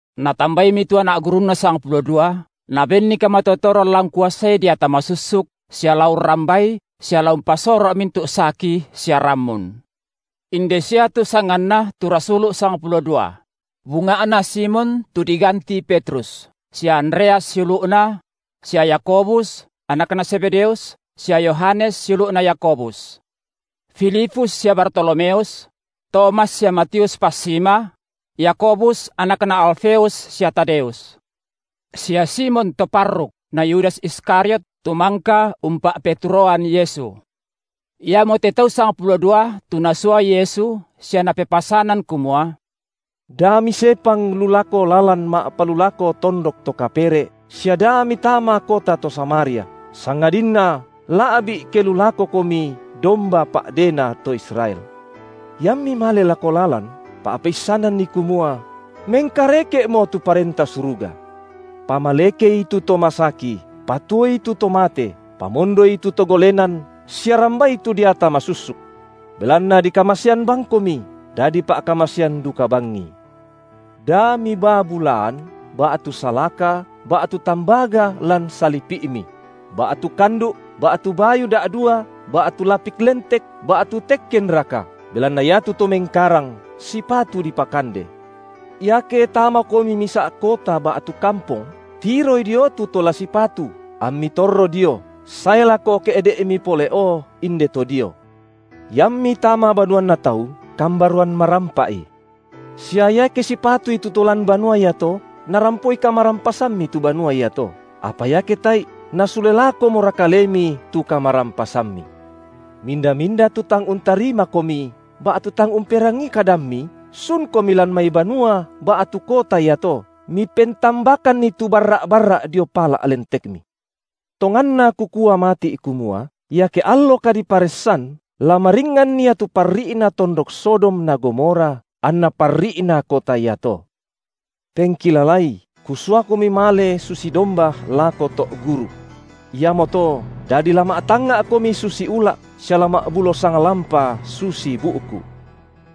Natambaimi tu anak gurunNa sang pulo dua, Nabenni kamatotoran la ungkuasai deata masussuk sia la urrambai sia la umpasoro’ mintu’ saki sia rammun. Inde sia tu sanganna tu rasulu’ sangpulo dua: Bunga’na Simon tu diganti Petrus, sia Andreas siulu’na; sia Yakobus, anakna Zebedeus, sia Yohanes siulu’na Yakobus; Filipus sia Bartolomeus; Tomas sia Matius passima; Yakobus anakna Alfeus sia Tadeus; sia Simon to parruk na Yudas Iskariot, tu mangka umpa’peturoan Yesu. Iamote tau sangpulo dua tu Nasua Yesu sia Napepasanan kumua: Da misepang lu lako lalan ma’palulako tondok to kapere’ sia da mitama kota to Samaria, sangadinna la’bi’ ke lu lakokomi domba pa’dena to Israel. Iammi male lako lalan pa’peissananni kumua: Mengkareke’mo tu Parenta Suruga. Pamalekei tu to masaki, patuoi tu to mate, pamondoi tu to golenan sia rambai tu deata masussuk. Belanna dikamasean bangkomi, dadi pa’kamasean duka bangi. Da mibaa bulaan ba’tu salaka ba’tu tambaga lan salipi’mi; ba’tu kandu’, ba’tu bayu da’dua, ba’tu lapik lentek, ba’tu tekkenraka, belanna iatu to mengkarang sipatu dipakande. Iake tamakomi misa’ kota ba’tu kampong, tiroi dio tu to la sipatu, ammi torro dio, sae lako ke’de’mi pole’o inde to dio. Iammi tama banuanna tau, kambaroan marampa’i. Sia iake sipatui tu to lan banua iato, narampoi kamarampasammi tu banua iato; apa iake tae’i, nasule lakomora kalemi tu kamarampasammi. Minda-minda tu tang untarimakomi, ba’tu tang umperangii kadammi, sunkomi lan mai banua ba’tu kota iato, mipentambakanni tu barra’-barra’ dio pala’ lentekmi. Tonganna Kukua mati’ kumua, iake allo kadiparessan la maringngan ia tu parri’na tondok Sodom na Gomora anna parri’na kota iato. Pengkilalai, Kusuakomi male susi domba lako to’ guruk. Iamoto, dadi la ma’tangnga’komi susi ula’, sia la ma’bulo sanglampa, susi bu’ku.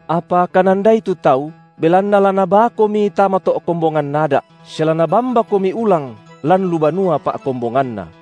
Apa kanandai tu tau, belanna la nabaakomi tama to’ kombongan ada’, sia la nabambakomi ulang lan lu banua pa’kombonganna.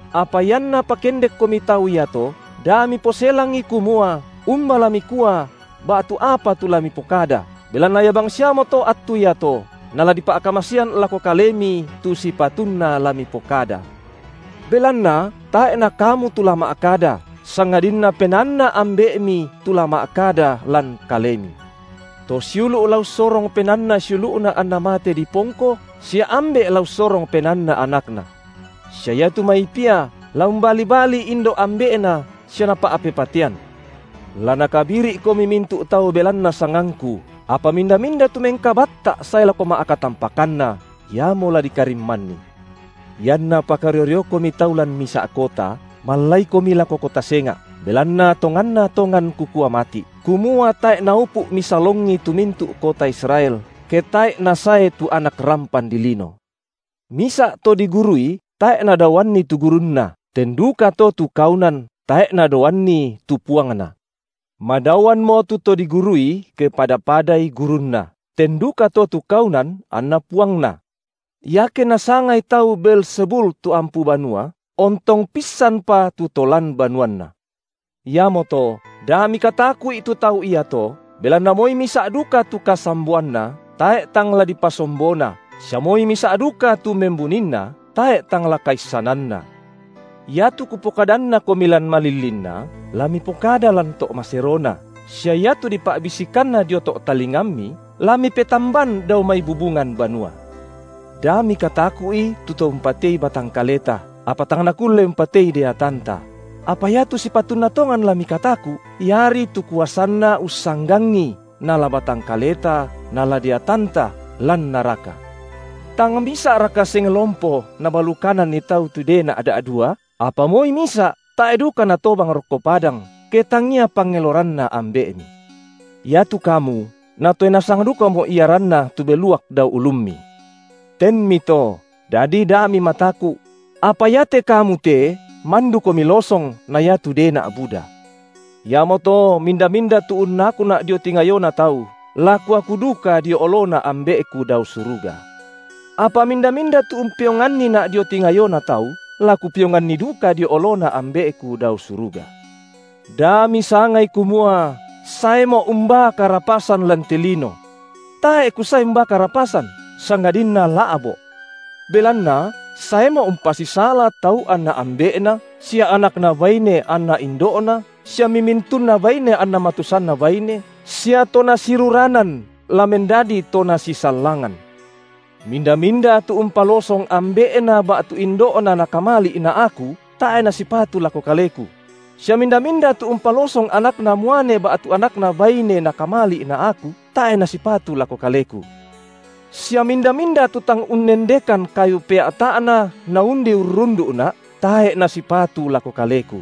Apa ianna pakendekkomi tau iato, da miposelangi kumua umba la mikua ba’tu apa tu la mipokada, belanna ia bangsiamoto attu iato, nala dipa’kamasean lako kalemi tu sipatunna la mipokada. Belanna tae’ na kamu tu la ma’kada, sangadinna PenaanNa Ambe’mi tu la ma’kada lan kalemi. To siulu’ la ussorong penaanna siulu’na anna mate dipongko, sia ambe’ la ussorong penaanna anakna. Sia iatu mai pia la umbalibali indo’ ambe’na sia napa’pepatean. La nakabiri’komi mintu’ tau tu belanna sangangKu, apa minda-minda tu mengkabatta’ sae lako ma’katampakanna, iamo la dikarimmanni. Ianna pakario-riokomi tau lan misa’ kota, mallaikomi lako kota senga’, belanna tonganna tongan Kukua mati’, kumua tae’ naupu’ misalongi tu mintu’ kota Israel, ke tae’i nasae tu Anak rampan dilino. Misa’ to digurui tae’ nadaoanni tu gurunna, ten dukato tu kaunan tae’ nadaoanni tu puangna. Madaoammo tu to digurui ke pada-padai gurunna, ten dukato tu kaunan anna puangna. Iake nasangai tau Beelzebul tu ampu banua, ontong pissanpa tu to lan banuanna. Iamoto, da mikataku’i tu tau iato, belanna moi misa’ duka tu kasamboanna, tae’ tang la dipasombona, sia moi misa’ duka tu membuninna, tae’ tang la kaissananna. Iatu Kupokadannakomi lan malillinna, la mipokada lan to’ maserona; sia iatu dipa’bisikanna dio to’ talingammi, la mipetamban dao mai bubungan banua. Da mikataku’i tu to umpatei batang kaleta, apa tang nakulle umpatei deatanta; apa iatu sipatunna tongan la mikataku’, Iari tu kuasanna ussanggangi nala batang kaleta nala deatanta, lan naraka. Tang misa’raka seng lompo nabalukananni tau tu dena’ da’dua? Apa moi misa’ tae’ duka natobang rokko padang, ke tangia pangeloranNa Ambe’mi. Iatu kamu Natoe nasang dukamo iaranna tu beluak dao ulummi. Tenmito, dadi da mimataku’: apa iate kamu te mandukomi losong na iatu dena’ buda. Iamoto, minda-minda tu unnakuNa’ dio tingayona tau, la Kuaku duka dio oloNa Ambe’Ku dao suruga. Apa minda-minda tu umpeonganniNa’ dio tingayona tau, la Kupeonganni duka dio oloNa Ambe’Ku dao suruga. Da misangai kumua saeMo’ umbaa karapasan lan te lino. Tae’ Kusae umbaa karapasan, sangadinna la’bo’. Belanna saeMo’ umpasisala tau anna ambe’na, sia anakna baine anna indo’na sia mimintunna baine anna matusanna baine, sia to nasiruranan la mendadi to nasisallangan. Minda-minda tu umpalosong ambe’na ba’tu indo’na nakamali’ na Aku, tae’ nasipatu lako Kaleku; sia minda-minda tu umpalosong anakna muane ba’tu anakna baine nakamali’ na Aku, tae’ nasipatu lako Kaleku. Sia minda-minda tu tang unnendekan kayu pea’ta’na naundi urrundu’Na, tae’ nasipatu lako Kaleku.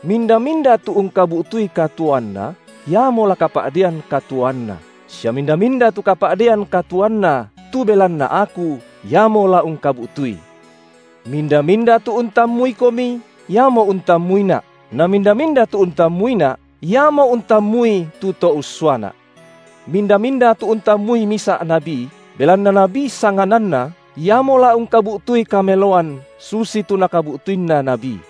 Minda-minda tu ungkabu’tui katuoanna, iamo la kapa’dean katuoanna, sia minda-minda tu kapa’dean katuoanna, tu belanna Aku, iamo la ungkabu’tui. Minda-minda tu untammuikomi, iamo untammuiNa’, na minda-minda tu untammuiNa’, iamo untammui tu To ussuaNa’. Minda-minda tu untammui misa’ nabi, belanna nabi sangananna iamo la ungkabu’tui kameloan susitu nakabu’tuinna nabi;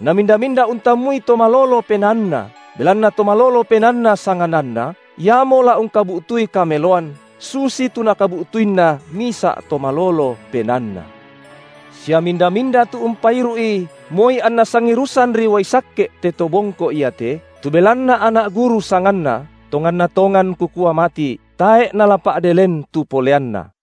na minda-minda untammui to malolo penaanna, belanna to malolo penaanna sangananna, iamo la ungkabu’tui kameloan susitu nakabu’tuinna misa’ to malolo penaanna. Sia minda-minda tu umpairu’i moi anna sangirusanri uai sakke’ te to bongko iate, tu belanna anak guru sanganna, tonganna tongan Kukua mati’, tae’ nala pa’de len tu poleanna.